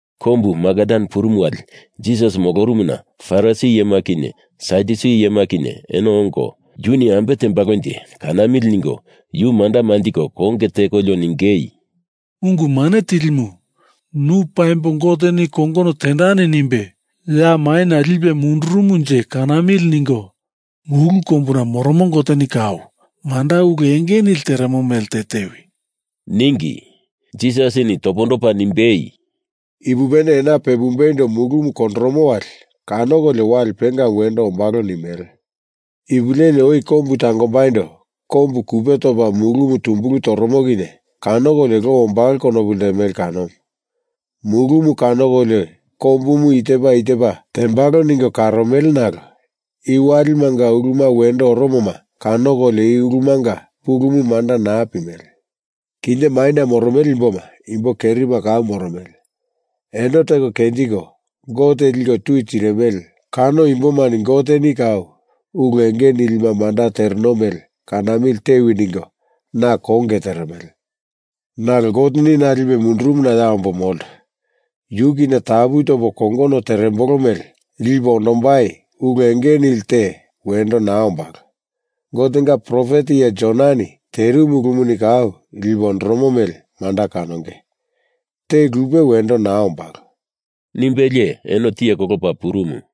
Kombu Magadan purumu wali Jisas molorumuna Farisi iyema kinye Sadyusi iyema kinye eno ongo, yuni ambe tembalonje, kanamili ningo yu manda manjiko konge tekolio ningei, “Ungu Mane Tilimu, nu paimbo Goteni kongono tendani nimbe ya maina lipe mundurumunje kanamili ningo mulu kombuna moromo Goteni kau manda ulu enge nili teremo mele te tewi,” ningi. Jisasini topondopa nimbei, “Ipupene ena pepumbeindo mulumu kondoromo wali kanokolio wali pengamu wendo ombalo nimele. Ipu leli oi kombu tangombaindo kombu kupe topa mulumu tumbulu toromo kinye kanokolio lo ombalo konopu ltemele kanomu. Mulumu kanokolio kombumu i tepa i tepa tembalo ningo karomele nalo i walimanga uluma wendo oromoma kanokolio ulumanga pulumu manda naa pimele. Kinye maina moromele imboma imbo kerima kau moromele. Eno teko kenjiko Gote liko tui tirimele kano imbomani Goteni kau ulu enge nilima manda teremo mele kanamili tewi ningo na konge teremele. Nalo Goteni na lipe mundurumuna ya ombo molto. Yu kinye tapu topo kongono terembolo mele lipe ondombai ulu enge nili te wendo naa ombalo. Gotenga profet iye Jonani terimu ulumuni kau lipe ondoromo mele manda kanonge. Te lupe wendo naa ombalo,” nimbelie eno tiye kolopa purumu.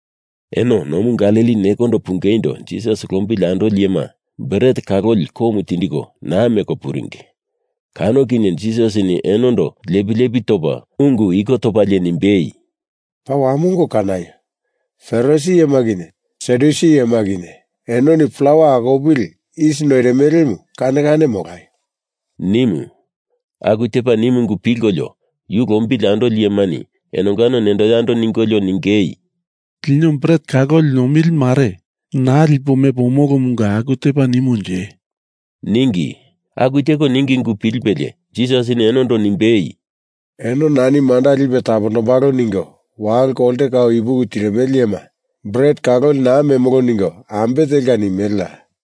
Eno nomu Galili nekondo pungeindo Jisas lombili andoli iyema bret kaloli komu tindiko naa meko puringi. Kano kinye Jisasini enondo lepi lepi topa ungu iko topalie nimbei, “Paa wamongo kanaio! Farisi iyema kinye Sadyusi iyema kinye enoni plawa akopili isi noirimelemu kane kane molaio!” nimu. Aku tepa nimu ungu pilkolio yu lombili andoli iyemani enongano nendo yando ningolio ningei, “Lino bret kaloli nomili mare naa lipo mepo omolomunga aku tepa nimonje,” ningi. Aku teko ningi ungu pilipelie Jisasini enondo nimbei, “Eno nani manda lipe tapombalo ningo walo kolte kau ipuki tirimele iyema, bret kaloli naa memolo ningo ambe telka nimeleya?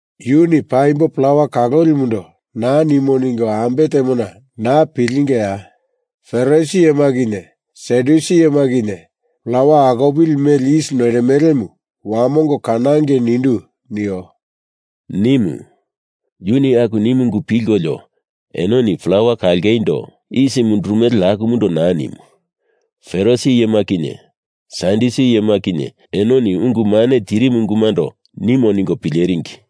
Yuni paimbo plawa kalolimundo naa nimo ningo ambe temona naa pilengeya? Farisi iyema kinye Sadyusi iyema kinye plawa akopili mele isi noirimelemu wamongo kanangei nindu nio,” nimu. Yuni aku nimu ungu pilkolio enoni plawa kalongeindo isi mundurumele akumundo naa nimo, Farisi iyema kinye Sadyusi iyema kinye enoni ungu mane tiringi ungumando nimo ningo pileringi.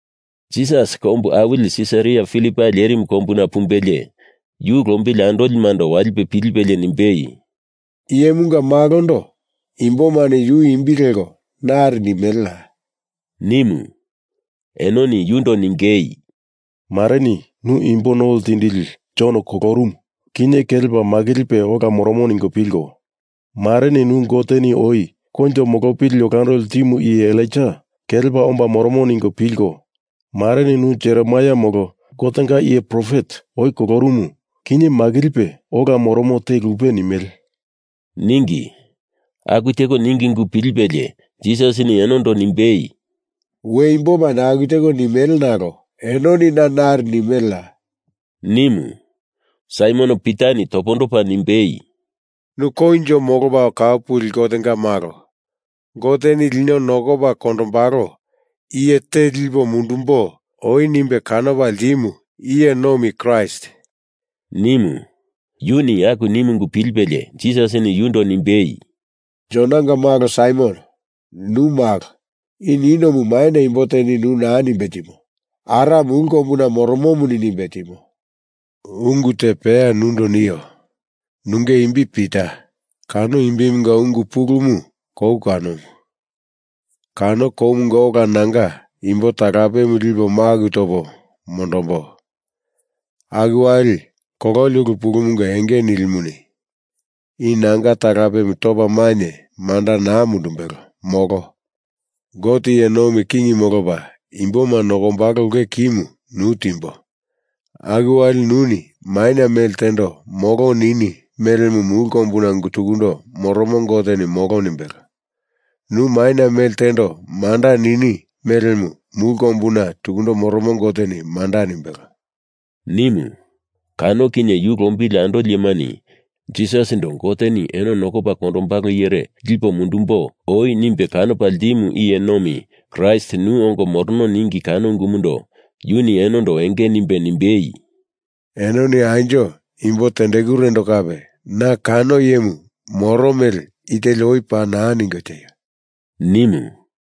Jisas kombu awili Sisaria Filipai lerimu kombuna pumbelie, yu lombili andolimando walipe pilipelie nimbei, “Iyemunga Malondo imbomani Yu imbi leko nari nimeleya?” nimu. Enoni yundo ningei, “Mareni nu imbo no ltindili Jon kolorumu, kinye kelepa makilipe ola moromo ningo pilko, mareni nu Goteni oi koinjo molopili olando ltimu iye Elaija kelepa omba moromo ningo pilko, mareni nu Jeremaia molo Gotenga iye profet oi kolorumu kinye makilipe ola moromo te lupe nimele,” ningi. Aku teko ningi ungu pilipelie Jisasini enondo nimbei, “We imbomani aku teko nimele nalo enoni na nari nimeleya?” nimu. Saimon Pitani topondopa nimbei, “Nu Koinjo Molopa Kau Puli Gotenga Malo, Goteni lino nokopa kondombalo iye te lipo mundumbo oi nimbe kanopa ltimu iye nomi Kraist,” nimu. Yuni aku nimu ungu pilipelie Jisasini yundo nimbei, “Jonanga malo Saimon, nu malo. I ninomu maina imbo teni nu naa nimbe timo. Ara mulu kombuna moromomuni nimbe timo. Ungu te peya nundo nio. Nunge imbi Pita, kano imbimunga ungu pulumu kou kanomu. Kano koumunga ola nanga imbo talapemu lipo maku topo mondombo. Aku wali kololi ulu pulumunga enge nilimuni i nanga talapemu topa mainye manda naa mundumbelo, molo. Gote iye nomi king molopa imboma nokombalo ulke kimu nu timbo. Aku wali nuni maina mele tendo molo nini melemu mulu kombuna tukundo moromo Goteni molo nimbelo. Nu maina mele tendo manda nini melemu mulu kombuna tukundo moromo Goteni manda nimbelo,” nimu. Kano kinye yu lombili andolimani Jisasindo Goteni eno nokopa kondombalo iyere lipo mundumbo oi nimbe kanopa ltimu iye nomi Kraist nu ongo morono ningi kano ungumundo yuni enondo enge nimbe nimbei, “Enoni anjo imbo tendekurendo kape na kano iyemu moro mele i teli oi paa naa ningo tieio!” nimu.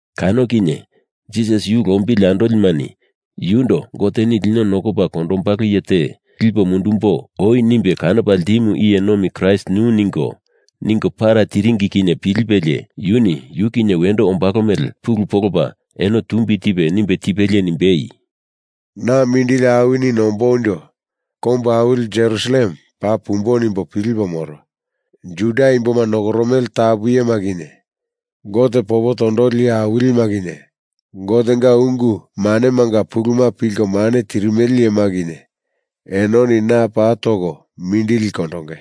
Kano kinye Jisas yu lombili andolimani yundo Goteni lino nokopa kondombalo iye te lipo mundumbo oi nimbe kanopa ltimu iye nomi Kraist nu ningo, ningo para tiringi kinye pilipelie yuni yu kinye wendo ombalo mele pulu polopa eno tumbi tipe nimbe tipelie nimbei, “Na mindili awini nomboindo kombu awili Jerusalem paa pumbo nimbo pilipo moro. Juda imboma nokoromele tapu iyema kinye, Gote popo tondoli iye awilima kinye, Gotenga ungu manemanga puluma pilko mane tirimele iyema kinye, enoni na paa toko mindili kondonge.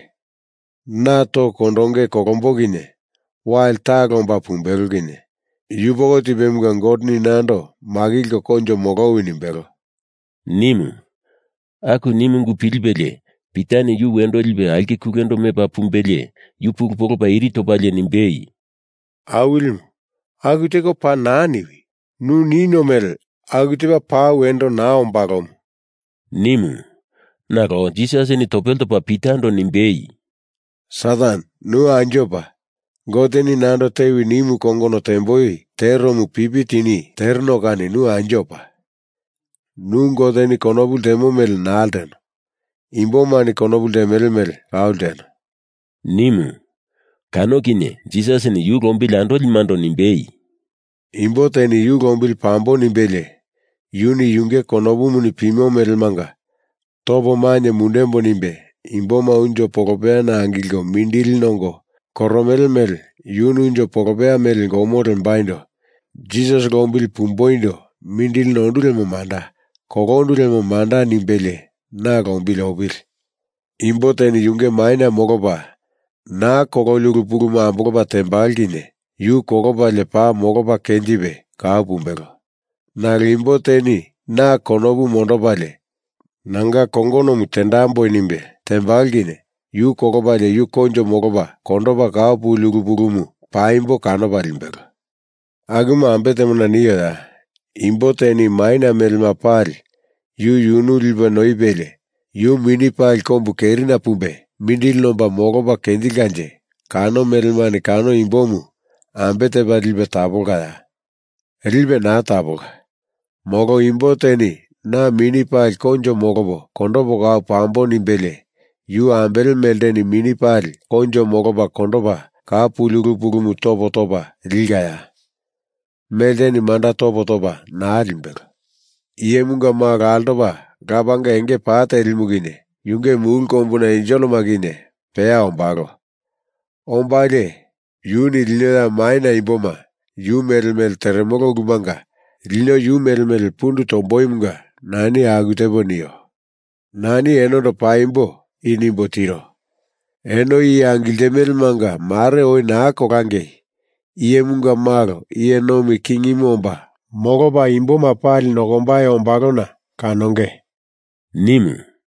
Na toko kondonge kolombo kinye, wali talo omba pumbelo kinye yupoko tipemunga Goteni nando makilko koinjo molowi nimbelo,” nimu. Aku nimu ungu pilipelie Pitani yu wendo lipe aulke kulendo mepa pumbelie yu pulu polopa iri topalie nimbei, “Awilimu, aku teko paa naa niwi! Nu nino mele aku tepa paa wendo naa ombalomu,” nimu. Nalo Jisasini topele topa Pitando nimbei, “Satan, nu anjo pa! Goteni nando tewi nimu kongono temboi teromu pipi tini tereno kani nu anjo pa! Nu Goteni konopu ltemo mele naa lteno. Imbomani konopu ltemele mele kau lteno,” nimu. Kano kinye Jisasini yu lombili andolimando nimbei, “Imbo teni yu lombili pambo nimbelie yuni yunge konopumuni pimo melemanga topo mainye mundembo nimbe imboma unjo polopeyana angilko mindili nongo koromele mele yuni unjo polopeya mele gomo lembaindo Jisas lombili pumboindo mindili nondu lemo manda; kolondu lemo manda nimbelie na lombili opili. Imbo teni yunge maina molopa naa kololi ulu pulumu ambolopa tembalo kinye yu kolopalie paa molopa kenjipe kau pumbelo. Nalo imbo teni na konopu mondopalie nanga kongonomu tendamboi nimbe tembalo kinye yu kolopalie yu koinjo molopa kondopa kau puli ulu pulumu paimbo kanopa limbelo. Akumu ambe temona nioya? Imbo teni maina melema pali yu yunu lipe noipelie yu mini pali kombu kerina pumbe mindili nomba molopa kenjilkanje kano melemani kano imbomu ambe tepa lipe tapolkaya? Lipe naa tapolka. Molo imbo teni na mini pali koinjo molopo kondopo kau pambo nimbelie yu ambele melteni mini pali koinjo molopa kondopa kau puli ulu pulumu topo topa likaya? Melteni manda topo topa naa limbelo. Iyemunga Malo altopa Lapanga enge pa telimu kinye yunge mulu kombuna enselema kinye peya ombalo. Ombalie yuni lino ya maina imboma yu mele mele teremele ulumanga lino yu mele mele pundu tomboimunga nani aku tepo nio. Nani enondo paimbo i nimbo tiro. Eno iye angiltimelemanga mare oi naa kolangei Iyemunga Malo iye nomi kingimu omba molopa imboma pali nokombai ombalona kanonge,” nimu.